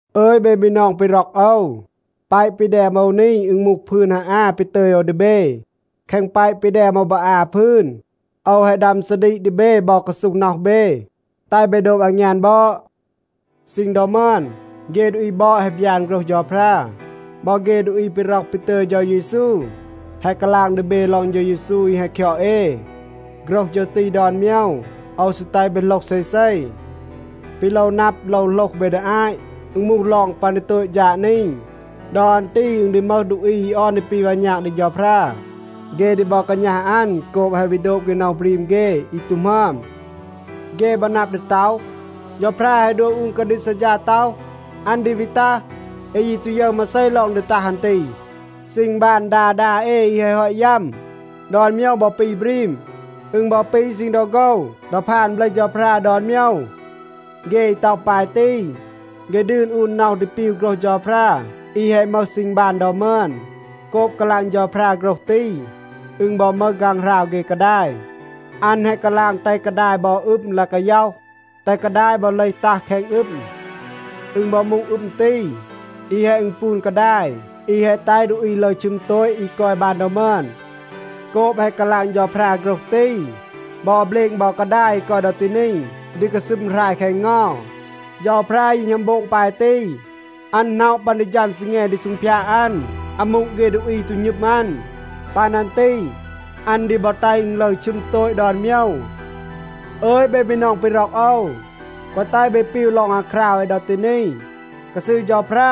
อึย เบ บีนอง ปี ร็อก โอว, แปะ ปี แดม โอว นี, อึณ มูห พืน ฮาอา ปี ตึย โอว ดี เบ. แคง แปะ ปี แดม โอว บอ อา พืน โอว แฮะ ดัม ซาดีก ดี เบ บอ กาซูห น็อห เบ, แตห เบ โดบ อางยาน บอด. ซีณ ดอ มึอน เฆ ดูอี บอด แฮะ บยาน โฆรห เฌาพรา. บอ เฆ ดูอี ปี ร็อห ปี ตึย เฌา เยซู แฮะ กาลาง ดี เบ ลอง เฌา เยซู อี แฮะ คยอด เอ. โฆรห ฌึร ตี ดอน โมยว, โอว ซี แตห เบ โหลห เซเซ. ปี โลว นับ, โลว โหลห เบ ดี อาต, อึณ มูห ลอง ปัน ดี โตต ฌาด นี. ดอ อัน ตี อึณ ดี มึห ดูอี อี ออน ดี ปี วาณาก ดี เฌาพรา. เฆ ดี บอ กาณัห อัน โกบ แฮะ วี โดบ เฆ น็อห บรีม เฆ อี ตู หมึอม. เฆ บอ นับ ดี ต็อห, “เฌาพรา แฮะ ดัว อูน กาดีก ซัดฌา ต็อห, อัน ดี วี ตัห. เอ ยี ตู ยึร มาเซ ลอง ดี ตัห อัน ตี. ซีณ บาน ดา ดา เอ อี แฮะ ฮอต ยัม, ดอน โมยว บอ ปี บรีม. อึณ บอ ปี ซีณ ดอ โฆว ดอ พาน เบลห เฌาพรา ดอน โมยว.” เฆ อี ต็อห ปาย ตี, เฆ ดืน อูน น็อห ดี ปีว โฆรห เฌาพรา อี แฮะ มึห ซีณ บาน ดอ มึอน. โกบ กาลาง เฌาพรา โฆรห ตี, อึณ บอ มึห ฆางหราว เฆ กาดาย. อัน แฮะ กาลาง แตห กาดาย บอ อึม ลาย กาย็อห, แตห กาดาย บอ เลห ตัห แคง อึม. อึณ บอ มูห อึม ตี, อี แฮะ อึณปูน กาดาย อี แฮะ แตห ดูอี ลึร ชึม โตต อี กอย บาน ดอ มึอน. โกบ แฮะ กาลาง เฌาพรา โฆรห ตี, บอ เบลณ บอ กาดาย อี กอย ดอ ตี นี ดี กาซึม หราย แคง เงา. เฌาพรา ยี หณัม โบง ปาย ตี. อัน หน็อะ ปัน ดี ฌัม ซีแง ดี ซูงพยาด อัน อามู เฆ ดูอี อี ตู หณึม อัน. ปัน อัน ตี, อัน ดี บอ แตห อึณ ลึร ชึม โตต ดอน โมยว. อึย เบ บีนอง ปี ร็อก โอว, แกวะ แตห เบ ปีว ลอง อาคราว เอ ดอ ตี นี. กาซืร เฌาพรา,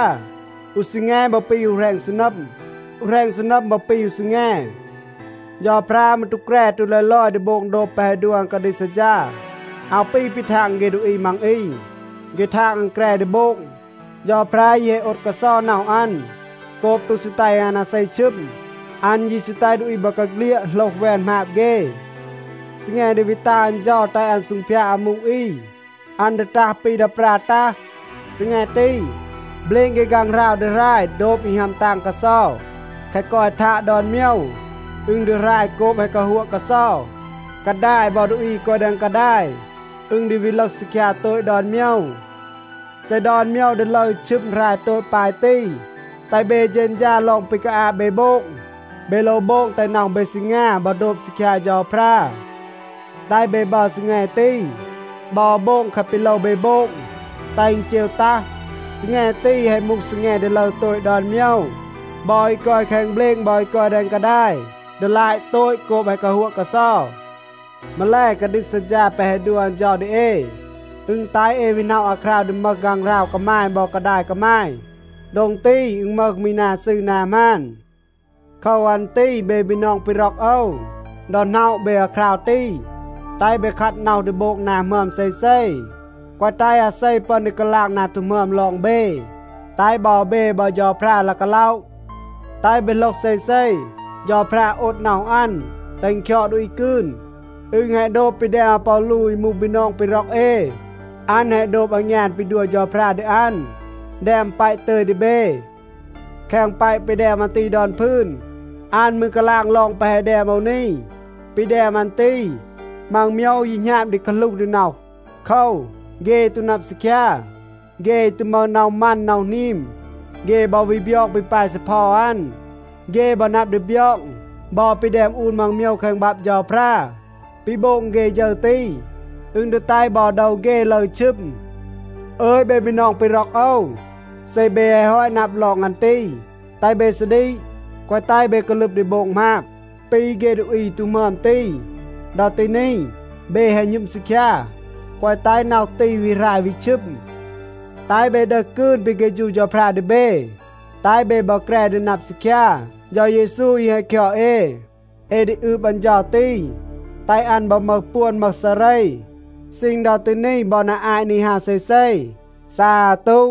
อู ซีแง บอ ปี อู แหรณ ซีนัม. อู แหรณ ซีนัม บอ ปี อู ซีแง. เฌาพรา มืร ตู แกร ตู ลอย ลอย ดี โบง โดบ แปะ แฮะ ดัว อัน กาดีก ซัดฌา. อาว ปี ปี ทาง เฆ ดูอี มัง อี. เฆ ทาง อัน แกร ดี โบง. เฌาพรา ยี แฮะ โอด กาเซา น็อห อัน โกบ ตู ซี แตห อัน อาเซ ชึม. อัน ยี ซี แตห ดูอี บอกาเฆลียด โหลห แวน หมาบ เฆ. ซีแง ดี วี ตัห อัน เฌา แตห อัน ซูงพยาด อามู อี, อัน ดี ตัห ปี ดา ปรา ตัห. ซีแง ตี, เบลณ เฆ ฆางหราว ดี หราย โดบ อี ฮัม ตาง กาเซา. แคะ กอย ทาด ดอน โมยว, อึณ ดี หราย โกบ แฮะ กาฮัวะ กาเซา. กาดาย บอ ดูอี อี กอย แดง กาดาย อึณ ดี วี ลึห ซีคยา โตต ดอน โมยว. เซ ดอน โมยว ดี ลึร ชึม หราย โตต ปาย ตี, แตห เบ เฌณฌา ลอง ปี กาอาบ เบ โบง. เบ โลว โบง แตห น็อห เบ ซีงา บอ โดบ ซีคยา เฌาพรา. แตห เบ บัร ซีแง ตี, บอ โบง แคะ ปี โลว เบ โบง, แตห อึณ เจว ตัห. ซีแง ตี, แฮะ มูห ซีแง ดี ลึร โตต ดอน โมยว. บอ อี กอย แคง เบลณ บอ อี กอย แดง กาดาย ดี ลาต โตต โกบ แฮะ กาฮัวะ กาเซา. มาแล, กาดีก ซัดฌา แปะ แฮะ ดัว อัน เฌา ดี เอ, อึณ แตห เอ วี หน็อะ อาคราว ดี มึห ฆางหราว กามาย บอ กาดาย กามาย. โดง ตี, อึณ มึห มี นา ซืร นา หมาน. โคว อัน ตี เบ บีนอง ปี ร็อก โอว, ดอ หน็อะ เบ อาคราว ตี, แตห เบ คัด น็อห ดี โบง นา หมึอม เซเซ, แกวะ แตห อาเซ ปึอน ดี กาลาง นา ตู หมึอม ลอง เบ. แตห บอ เบ บอ เฌาพรา ลาย กาล็อะ. แตห เบ โหลห เซเซ, เฌาพรา โอด น็อห อัน, แตห อึณ คยอด ดูอี กืน. อึณ แฮะ โดบ ปี แดม อาปอลู อี มูห บีนอง ปี ร็อก เอ. อัน แฮะ โดบ อางยาน ปี ดัว เฌาพรา ดี อัน, แดม แปะ ตึย ดี เบ. แคง แปะ ปี แดม อัน ตี ดอน พืน, อัน มืร กาลาง ลอง แปะ แฮะ แดม โอว นี. ปี แดม อัน ตี, มัง โมยว ยี หณาบ ดี กาหลูห ดี น็อห. โคว, เฆ อี ตู นับ ซีคยา, เฆ อี ตู มึห น็อห มัน, น็อห หนีม, เฆ บอ วี บยอง ปี ปาย ซีเพา อัน. เฆ บอ นับ ดี บยอง บอ ปี แดม อูน มัง โมยว แคง บับ เฌาพรา. ปี โบง เฆ ฌึร ตี, อึณ ดี แตห บอ โดว เฆ ลึร ชึม. อึย เบ บีนอง ปี ร็อก โอว, เซ เบ แฮะ ฮอต นับ ลอง อัน ตี, แตห เบ ซาดีก, แกวะ แตห เบ กาลึบ ดี โบง หมาบ ปี เฆ ดูอี อี ตู หมึอม ตี. ดอ ตี นี, เบ แฮะ หณึม ซีคยา. แกวะ แตห น็อห ตี วี หราย, วี ชึม. แตห เบ ดึห กืน ปี เฆฌู เฌาพรา ดี เบ, แตห เบ บอ แกร ดี นับ ซีคยา เฌา เยซู อี แฮะ คยอด เอ. เอ ดี อืบ อัน เฌา ตี, แตห อัน บอ มึห ปวน มึห ซาเร ซีณ ดอ ตี นี บอ นา อาต นี ฮาว เซเซ. ซาตู.